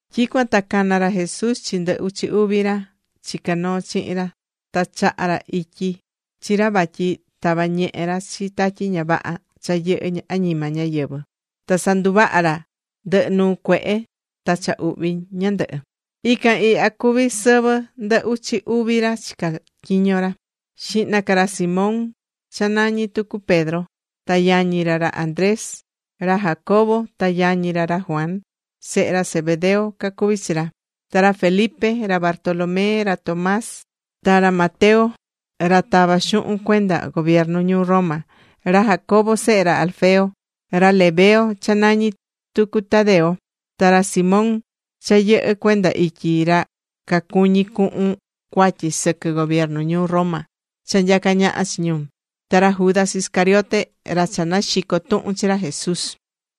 Tyicuan ta cana̱ ra Jesús chi ndɨ uchi uvi ra chicá noo chihin ra ta chaha̱ ra ityi chi ra vatyi tava ñehe ra chi tatyi ña vaha cha yɨhɨ́ añima ñáyɨvɨ, ta sanduvaha ra ndɨhɨ nuu cuehe ta cha uhvi ñandɨhɨ. Ican ihya cuví sɨvɨ ndɨ uchi uvi ra chicá tyiño ra: xihna ca, ra Simón, cha nañí tucu Pedro, ta yañi ra, ra Andrés, ra Jacobo ta yañi ra, ra Juan, sehe ra Zebedeo cacuví chi ra; ta ra Felipe, ra Bartolomé, ra Tomás, ta ra Mateo ra tava̱ xuhun cuenda gobiernu ñuu Roma, ra Jacobo sehe ra Alfeo, ra Lebeo cha nañí tucu Tadeo, ta ra Simón cha yɨhɨ́ cuenda ityi ra cacuñí cuhun cuatyi sɨquɨ gobiernu ñuu Roma cha nyacá ñaha chi ñu, ta ra Judas Iscariote, ra cha naxico̱ tuhun chi ra Jesús.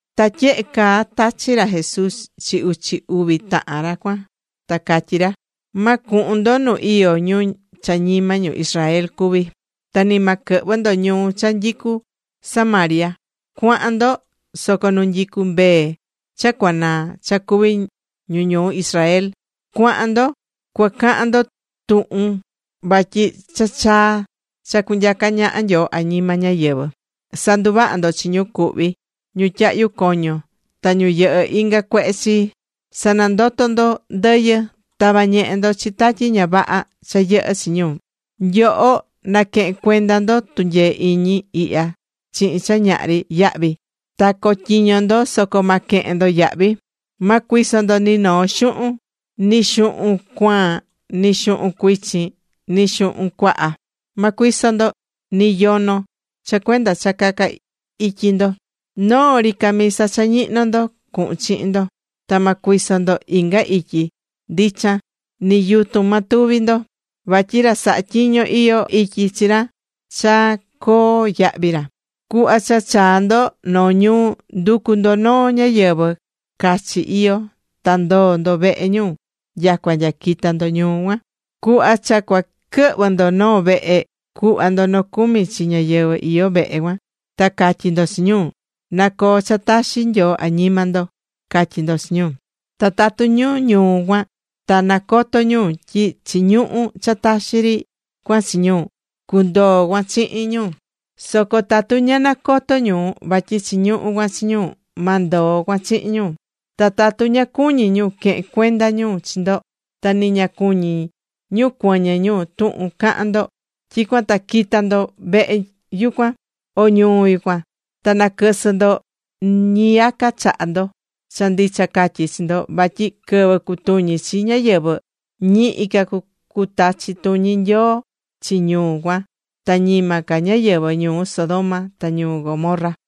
Ta tyehe caa tachi̱ ra Jesús chi uchi uvi tahan ra cuan, ta catyí ra: ―Ma cuhun ndo nu iyó ñu cha ñima ñu Israel cuví, ta ni ma quɨhvɨ ndo ñuu cha nyicú Samaria. Cua̱han ndo, soco nu nyicú mbee cha cuanaa cha cuví ñu ñuu Israel. Cua̱han ndo cuacahan ndo tuhun vatyi cha chaa̱ cha cunyaca ñaha Nyoo añima ñáyɨvɨ. Sa̱nduvaha ndo chi ñu cuhví ñu tyahyú coño, ta ñu yɨhɨ́ inga cuehe chii. Sa̱nandoto ndo ndɨyɨ, ta̱va ñehe ndo chi tatyi ña vaha cha yɨhɨ́ chi ñu. Nyoho, naquehén cuenda ndo tunyee iñi ihya chihin cha ñahri yahvi, ta co̱tyiño ndo soco ma quehen ndo yahvi. ’Ma cuiso ndo ni noo xuhun, ni xuhun cuaan ni xuhun cuichin, ni xuhun cuaha. Ma cuiso ndo ni yono cha cuenda cha caca ityi ndo. Noo ri camisa cha ñihnó ndo cuhun chihin ndo. Ta ma cuiso ndo inga ityi ndichan, ni yutun ma tuvi ndo, vatyi ra sahá tyiño, iyó ityi chi ra cha coo yahvi ra. ’Cuhva cha chaa ndo noo ñuu, ndu̱cu ndo noo ñáyɨvɨ cachi iyó, ta ndo̱o ndo vehe ñu nyacua nya quita ndo ñuu cuan. Cuhva cha cua quɨhvɨ ndo noo vehe, cu̱hva ndo nocumi chi ñáyɨvɨ iyó vehe cuan. Ta ca̱tyi ndo chi ñu: Na coo cha taxi Nyoo añima ndo, ca̱tyi ndo chi ñu. Ta tatu ñu ñuu cuan ta nacotó ñu tyi chiñuhú cha taxi ri cuan chi ñu, cundoo cuan chihin ñu. Soco tatu ña nacotó ñu vatyi chiñuhú cuan chi ñu, ma ndoo cuan chihin ñu. Ta tatu ña cuñí ñu quehen cuenda ñu chi ndo, ta ni ña cuñí ñu cuɨñɨ ñu tuhun cahán ndo, tyicuan ta qui̱ta ndo vehe yucuan, o ñuu yucuan, ta naquɨsɨ ndo ñiyaca chaha ndo. Cha ndicha catyí chi ndo vatyi quɨvɨ cutuñi chi ñáyɨvɨ, ñihi ca cutachi tuñi Nyoo chi ñu cuan, ta ñima ca ñáyɨvɨ ñuu Sodoma ta ñuu Gomorra.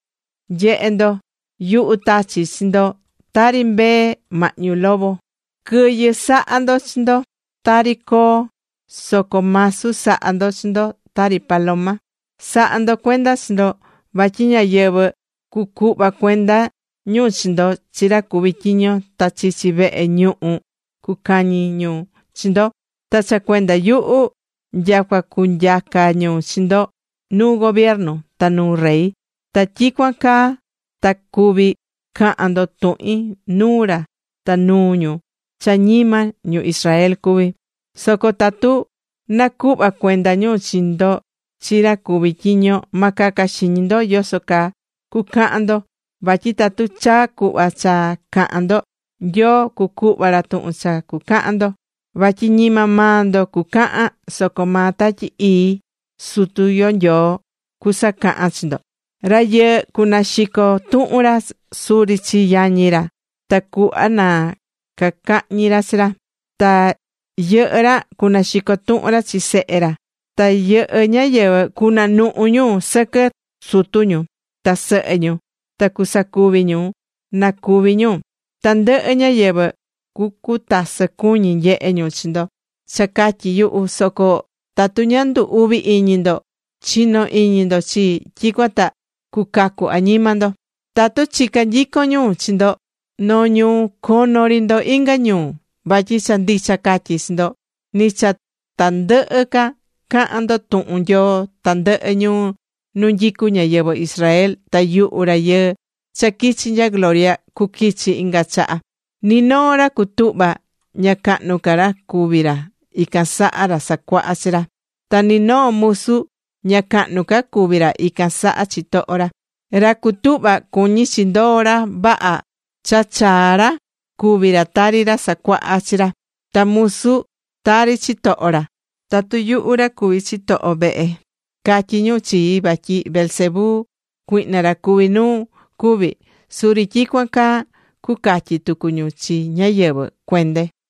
’¡Nye̱he ndo! Yuhu tachí chi ndo, tari mbee mahñu lobo. Quɨyɨ sa̱ha ndo chi ndo, tari coo, soco masu sa̱ha ndo chi ndo tari paloma. Sa̱ha ndo cuenda chi ndo vatyi ñáyɨvɨ cucuhva cuenda ñu chi ndo chi ra cuví tyiño, ta chichi vehe ñuhu cucañi ñu chi ndo. Ta cha cuenda yuhu, nyacua cunyaca ñu chi ndo nuu gobiernu ta nuu rey. Ta tyicuan caa ta cuví cahan ndo tuhin nuu ra ta nuu ñu cha ñima ñu Israel cuví. Soco tatu nacuhva cuenda ñu chi ndo chi ra cuví tyiño, ma caca xiñi ndo yoso caa cucahan ndo, vatyi tatu chaa cuhva cha cahan ndo, Nyoo cucuhva ra tuhun cha cucahan ndo. Vatyi ñima maa ndo cucahan, soco maa Tatyi Ii Sutu yo Nyoo cusacahan chi ndo. ’Rayɨɨ cunaxico tuhun ra suri chi yañi ra tacuhva na cacahñi ra chi ra. Ta yɨhɨ́ ra cunaxico tuhun ra chi sehe ra. Ta yɨhɨ ñáyɨvɨ cunanuhu ñu sɨquɨ sutu ñu ta sɨhɨ ñu, ta cusacuvi ñu, na cúvi ñu. Tandɨhɨ ñáyɨvɨ, cucutasɨ cuñi nyehe ñu chi ndo cha catyi yuhu. Soco tatu ña ndu uvi iñi ndo chino iñi ndo chii, tyicuan ta cucacu añima ndo. Tatu chica nyicon ñu chi ndo noo ñuu, cono ri ndo inga ñuu. Vatyi cha ndicha catyi chi ndo ni cha ta ndɨhɨ ca cahan ndo tuhun Nyoo tandɨhɨ ñuu nu nyicu ñáyɨvɨ Israel ta yuhu Rayɨɨ cha quichi nya gloria cuquichi inga chaha. ’Ni noo ra cutuhvá, ña cahnu ca ra cuví ra ican saha ra sacuaha chi ra. Ta ni noo musu, ña cahnu ca cuví ra ican saha chitoho ra. Ra cutuhva, cuñí chi ndoo ra vaha cha chaa ra cuvi ra tari ra sacuaha chi ra, ta musu tari chitoho ra. Tatu yuhu ra cuví chitoho vehe, catyí ñu chii vatyi Beelzebú, cuihna ra cuví nuu, cuví, suri tyicuan caa cucatyi tucu ñu chi ñáyɨvɨ cuende.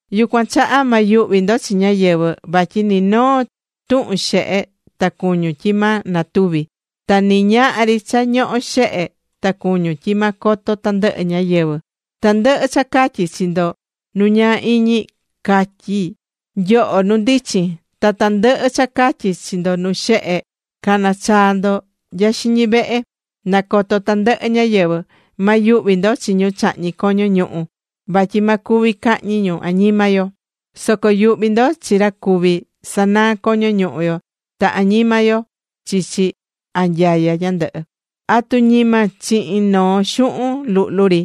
’Yucuan chaha ma yuhvi ndo chi ñáyɨvɨ, vatyi ni noo tuhun xehe ta cuñun, tyi ma natuvi. Ta ni ñahri cha ñohó xehe, ta cuñún tyi ma coto tandɨhɨ ñáyɨvɨ. Tandɨhɨ cha catyí chi ndo nu ñaa iñi, ca̱tyi nyoho nu ndichin. Ta tandɨhɨ cha catyi chi ndo nu xehe, ca̱na chaa ndo nya xiñi vehe, na coto tandɨhɨ ñáyɨvɨ. Ma yuhvi ndo chi ñu chahñí coño ñuhu yo, vatyi ma cuvi cahñi ñu añima yo. Soco yu̱hvi ndo chi ra cuví sanaa coño ñuhu yo ta añima yo chichi anyaya ñandɨhɨ. ’¿Atu ñima chihin noo xuhun luhlu ri,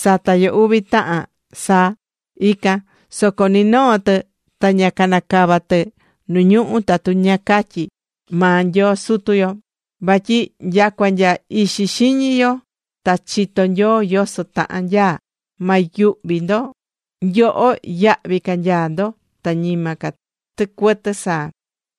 sata yo uvi tahan saa? Ican. Soco ni noo tɨ ña canacava tɨ nu ñuhú tatu ña catyí maa Nyoo Sutu yo. Vatyi nyacua nya ixi xiñi nyoho ta chitó Nyoo yoso tahan nyaá. Ma yuhvi ndo. Nyoho, yahvi ca nyaá ndo ta ñima ca tɨcuɨtɨ saa.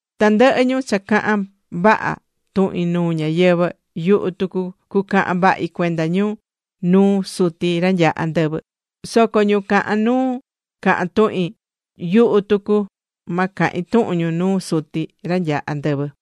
’Tandɨhɨ ñu cha cahán vaha tuhin nuu ñáyɨvɨ, yuhu tucu cucahan vahi cuenda ñu nuu Suti ra nyaá andɨvɨ. Soco ñu cahán nuu cahan tuhin, yuhu tucu ma cahin tuhun ñu nuu Suti ra nyaá andɨvɨ.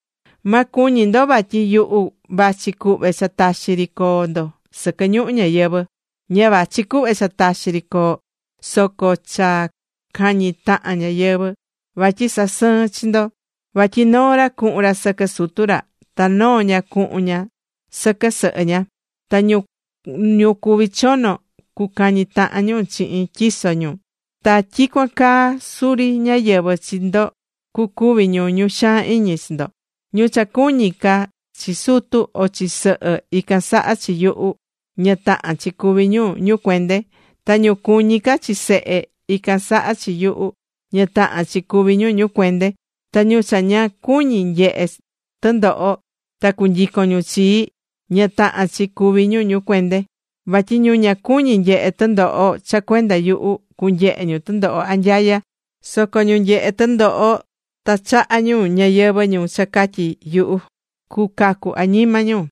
’Ma cuñi ndo vatyi yuhu vachi cuhve cha taxi ri coo ndo sɨquɨ ñuhu ñayɨvɨ̱ ihya. Ña vachi cuhve cha taxi ri, soco cha cañi tahan ñáyɨvɨ. Vatyi sasɨín chi ndo. Vatyi noo ra cuhun ra sɨquɨ sutu ra. Ta noo ña cuhun ña sɨquɨ sɨhɨ ña. Ta ñu cuví chono cucañi tahan ñu chihin tyiso ñu. Ta tyicuan caa suri ñáyɨvɨ chi ndo cucuvi ñu ñu xaan iñi chi ndo. ’Ñu cha cuñí ca chi sutu o chi sɨhɨ ican saha chi yuhu, ña tahán chi cuví ñu ñu cuende. Ta ñu cuñí ca chi sehe, ican saha chi yuhu, ña tahán chi cuví ñu ñu cuende. Ta ñu cha ña cuñí nyehe tɨndoho ta cunyicon ñu chii, ña tahán chi cuvi ñu ñu cuende. Vatyi ñu ña cuñí nyehe tɨndoho cha cuenda yuhu, cunyehe ñu tɨndoho anyaya, soco ñu nyehé tɨndoho ta chahá ñayɨvɨ̱ cha catyi yuhu, cucacu añima ñu.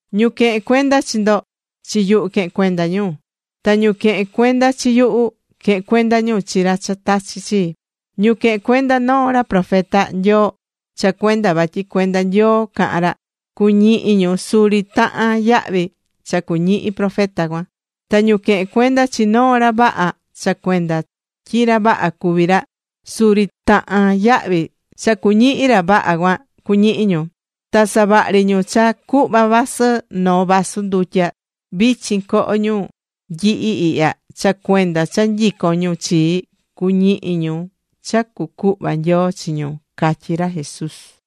’Ñu quehén cuenda chi ndo, chi yuhu quehén cuenda ñu, ta ñu quehén cuenda chi yuhu, quehén cuenda ñu chi ra cha tachi̱ chii. Ñu quehén cuenda noo ra profeta Nyoo cha cuenda vatyi cuenda Nyoo cahán ra, cuñihi ñu suri tahan yahvi cha cuñihi profeta cuan. Ta ñu quehén cuenda chi noo ra vaha cha cuenda tyi ra vaha cuví ra, suri tahán yahvi cha cuñihi ra vaha cuan cuñihi ñu. Ta savahri ñu cha cuhva vasɨ noo vasu ndutya vichin coho ñu nyihi ihya cha cuenda cha nyicón ñu chii, cuñihi ñu cha cucuhva Nyoo chi ñu ―catyí ra Jesús.